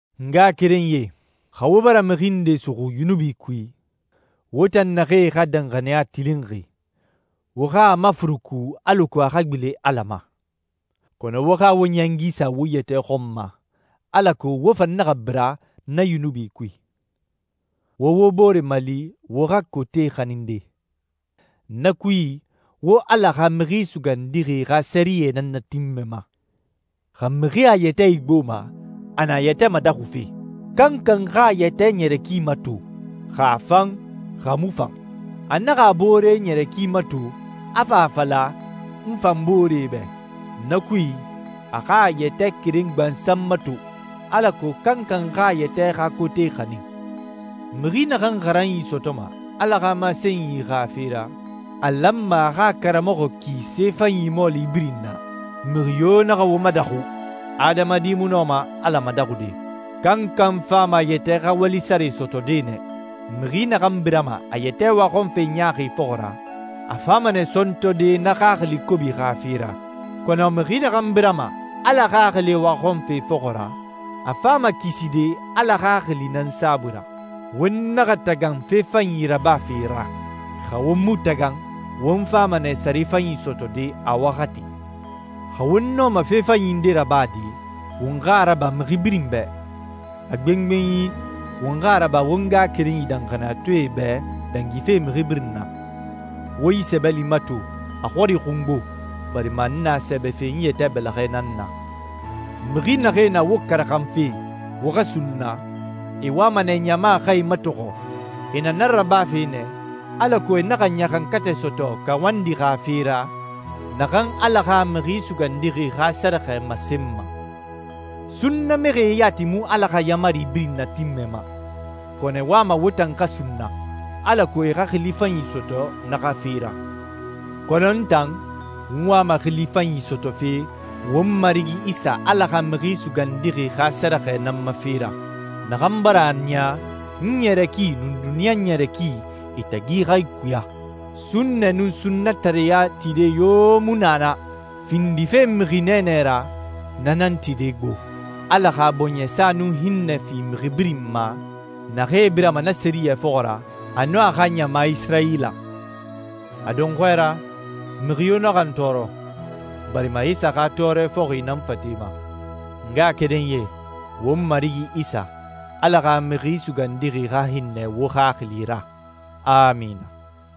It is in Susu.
N ngaxakerenyie, xa wo bara mixi nde suxu yunubi kui, wo tan naxee xa danxaniya tilinxi, wo xa a mafuruku alako a xa gbilen Ala ma. Kɔnɔ wo xa wo ɲɛngi sa wo yɛtɛ xɔn ma, alako wo fan naxa bira na yunubi kui. Wo wo bore mali wo xa kote xaninde. Na kui, wo Ala xa Mixi Sugandixi xa sɛriyɛ nan natinmɛma. Xa mixi a yɛtɛ igboma, a na a yɛtɛ madaxufe. Kankan xa a yɛtɛ ɲɛrɛ ki mato, xa a fan, xa a mu fan. A naxa a boore ɲɛrɛ ki mato, a fa a fala, «N fan boore bɛ.» Na kui, a xa a yɛtɛ keren gbansan mato, alako kankan xa a yɛtɛ xa kote xanin. Mixi naxan xaranyi sɔtɔma Ala xa masenyi xa fe ra, a lanma a xa a karamɔxɔ ki fe fanyi mɔɔli birin na. Mixi yo naxa wo madaxu. Adamadi mu nɔma Ala madaxude. Kankan fama a yɛtɛ xa wali sare sɔtɔde nɛ. Mixi naxan birama a yɛtɛ waxɔnfe ɲaaxi fɔxɔ ra, a fama nɛ sɔntɔde na xaxili kobi xa fe ra. Kɔnɔ mixi naxan birama Ala Xaxili waxɔnfe fɔxɔ ra, a fama kiside Ala Xaxili nan saabui ra. Won naxa tagan fe fanyi rabafe ra. Xa won mu tagan, won fama nɛ sare fanyi sɔtɔde a waxati. Xa won nɔma fe fanyi nde rabade, won xa a raba mixi birin bɛ. A gbengbenyi won xa a raba won ngaxakerenyi danxaniyatɔɛe bɛ dangife mixi birin na. Wo yi sɛbɛli mato, a xɔri xungbo, barima n na a sɛbɛfe n yɛtɛ bɛlɛxɛ nan na. Mixi naxee na wo karaxanfe wo xa sunna, e wama nɛ ɲama xa e matɔxɔ. E na na rabafe nɛ alako e naxa ɲaxankatɛ sɔtɔ kawandi xa fe ra, naxan Ala xa Mixi Sugandixi xa sɛrɛxɛ masenma. Sunnamixie yati mu Ala xa yaamari birin natinmɛma, kɔnɔ e wama wo tan xa sunna, alako e xa xili fanyi sɔtɔ na xa fe ra. Kɔnɔ n tan, n wama xili fanyi sɔtɔfe won Marigi Isa Ala xa Mixi Sugandixi xa sɛrɛxɛ nan ma fe ra, naxan bara a niya n ɲɛrɛ ki nun duniɲa ɲɛrɛ ki, e tagi xa ikuya. Sunnɛ nun sunnatareya tide yo mu na na. Findife mixi nɛɛnɛ ra, na nan tide gbo. Ala xa bɔɲɛsa nun hinnɛ fi mixi birin ma naxee birama na sɛriyɛ fɔxɔ ra, a nun a xa ɲama Isirayila. A dɔnxɔɛ ra, mixi yo naxa n tɔɔrɔ, barima Isa xa tɔɔrɛ fɔxi na n fate ma. N ngaxakerenyie, won Marigi Isa, Ala xa Mixi Sugandixi xa hinnɛ wo xaxili ra. Amina.